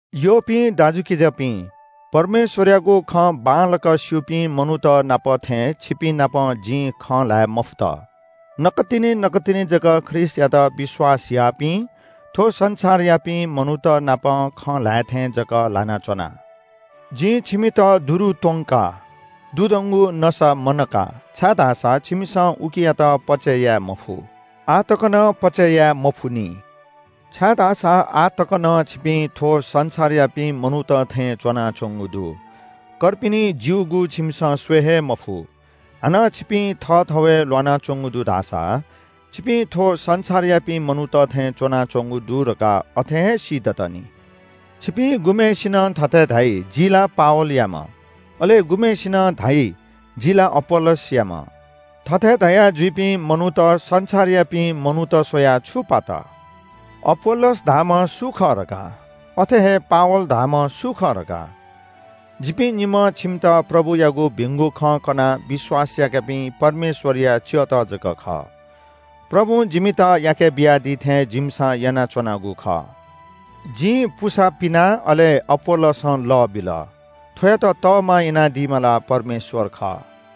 यःपिं दाजुकिजापिं, परमेश्‍वरयागु खँ बांलाक स्‍यूपिं मनूत नाप थें छिपिंनाप जिं खँ ल्‍हाये मफुत। नकतिनि नकतिनि जक ख्रीष्‍टयात विश्‍वास याःपिं थ्‍व संसारयापिं मनूत नाप खँ ल्‍हाये थें जक ल्‍हाना च्‍वना। जिं छिमित दुरु त्‍वंका, दुधंगु नसा मनका। छाय्‌धाःसा छिमिसं उकियात पचय् याये मफु, आः तक नं पचय् याये मफुनि। छाय्‌धाःसा आः तक नं छिपिं थ्‍व संसारयापिं मनूत थें च्‍वनाच्‍वंगु दु, कर्पिनि ज्‍यूगु छिमिसं स्‍वये हे मफु, हानं छिपिं थःथवय् ल्‍वानाच्‍वंगु दु धाःसा छिपिं थ्‍व संसारयापिं मनूत थें च्‍वनाच्‍वंगु दु धकाः अथें हे सीदत नि। छिपिं गुम्‍हय्‌सिनं थथे धाइ – “जि ला पावलयाम्‍ह,” अले गुम्‍हय्‌सिनं धाइ – “जि ला अपोल्‍लोसयाम्‍ह।” थथे धयाजुइपिं मनूत संसारयापिं मनूत स्‍वयाः छु पात? अपोल्‍लोस धाःम्‍ह सु खः धकाः? अथे हे पावल धाःम्‍ह सु खः धकाः? जिपिं निम्‍हं छिमित प्रभुयागु भिंगु खँ कनाः विश्‍वास याकापिं परमेश्‍वरया च्‍यःत जक खः। प्रभुं जिमित याकेबियादी थें जिमिसं यानाच्‍वनागु खः। जिं पुसा पिना, अले अपोल्‍लोसं लः बिल, थ्‍वयात तःमा यानादीम्‍ह ला परमेश्‍वर खः।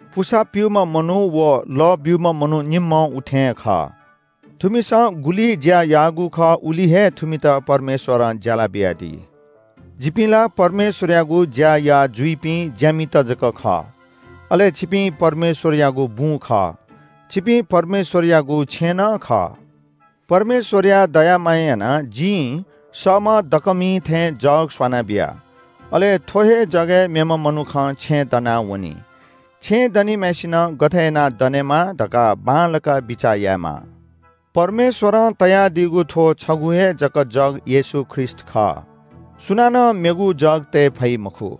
पुसा प्‍यूम्‍ह मनू व लः ब्‍यूम्‍ह मनू निम्‍हं उथें खः। थुमिसं गुलि ज्‍या याःगु खः उलि हे थुमित परमेश्‍वरं ज्‍याला बियादी। जिपिं ला परमेश्‍वरयागु ज्‍या याः जुइपिं ज्‍यामित जक खः, अले छिपिं परमेश्‍वरयागु बुँ खः। छिपिं परमेश्‍वरयागु छेँनं खः। परमेश्‍वरया दया मायां यानाः जिं सःम्‍ह दकःमिं थें जग स्‍वना बिया, अले थ्‍व हे जगय् मेम्‍ह मनुखं छेँ दना वनी। छेँ दनिम्‍हय्‌सिनं गथे यानाः दनेमाः धकाः बांलाक बिचाः यायेमाः। परमेश्‍वरं तयादीगु थ्‍व छगू हे जक जग येशू ख्रीष्‍ट खः। सुनानं मेगु जग तये फइ मखु।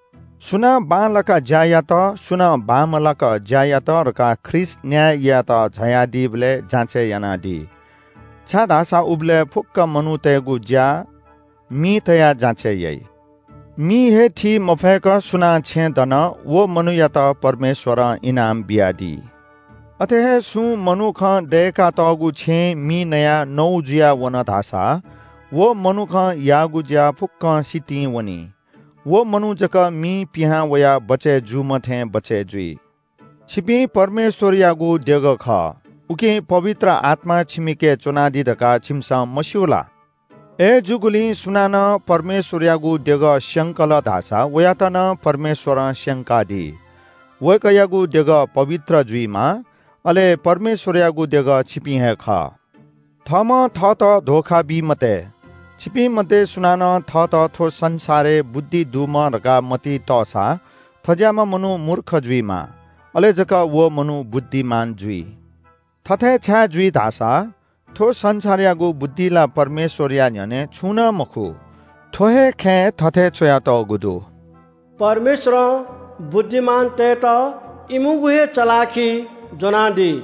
सुनां बांलाक ज्‍या यात, सुनां बांमलाक ज्‍या यात धकाः ख्रीष्‍ट न्‍याय यायेत झायादीबलय् जाँचय् यानादी। छाय्‌धाःसा उबलय् फुक्‍क मनूतय्‌गु ज्‍या मिइ तयाः जाँचय् याइ। मिं हे थी मफय्‌क सुनां छेँ दन व मनूयात परमेश्‍वरं इनाम बियादी। अथे हे सुं मनुखं दय्‌कातःगु छेँ मिं नयाः नौ जुयावन धाःसा व मनुखं याःगु ज्‍या फुक्‍कं सितिं वनी। व मनू जक मिं पिहां वयाः बचय् जूम्‍ह थें बचय् जुइ। छिपिं परमेश्‍वरयागु देगः खः, उकिं पवित्र आत्‍मा छिमिके च्‍वनादी धकाः छिमिसं मस्‍यू ला? अय्‌जूगुलिं सुनानं परमेश्‍वरयागु देगः स्‍यंकल धाःसा वयात नं परमेश्‍वरं स्‍यंकादी। वय्‌कःयागु देगः पवित्र जुइमाः। अले परमेश्‍वरयागु देगः छिपिं हे खः। थःम्‍हं थःत धोखा बी मते। छिपिं मध्‍ये सुनानं थःत थ्‍व संसारय् बुद्धि दुम्‍ह धकाः मतिइ तःसा थज्‍याःम्‍ह मनू मूर्ख जुइमा, अले जक व मनू बुद्धिमान जुइ। थथे छाय् जुइ धाःसा, थ्‍व संसारयागु बुद्धि ला परमेश्‍वरया न्‍ह्यःने छुं नं मखु, थ्‍व हे खँय् थथे च्‍वयातःगु दु – “परमेश्‍वरं बुद्धिमानतय्‌त इमिगु हे चलाखिइ ज्‍वनादी।”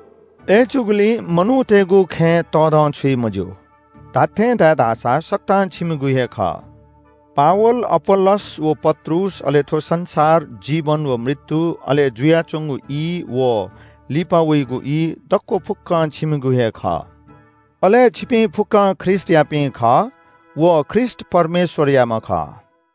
अय्‌जूगुलिं मनूतय्‌गु खँय् तःधंछुइ मज्‍यू। धात्‍थें धाये धाःसा सकतां छिमिगु हे खः। पावल, अपोल्‍लोस व पत्रुस, अले थ्‍व संसार, जीवन व मृत्‍यु, अले जुयाच्‍वंगु ई व लिपा वइगु ई, दक्‍व फुक्‍क छिमिगु हे खः। अले छिपिं फुक्‍कं ख्रीष्‍टयापिं खः व ख्रीष्‍ट परमेश्‍वरयाम्‍ह खः।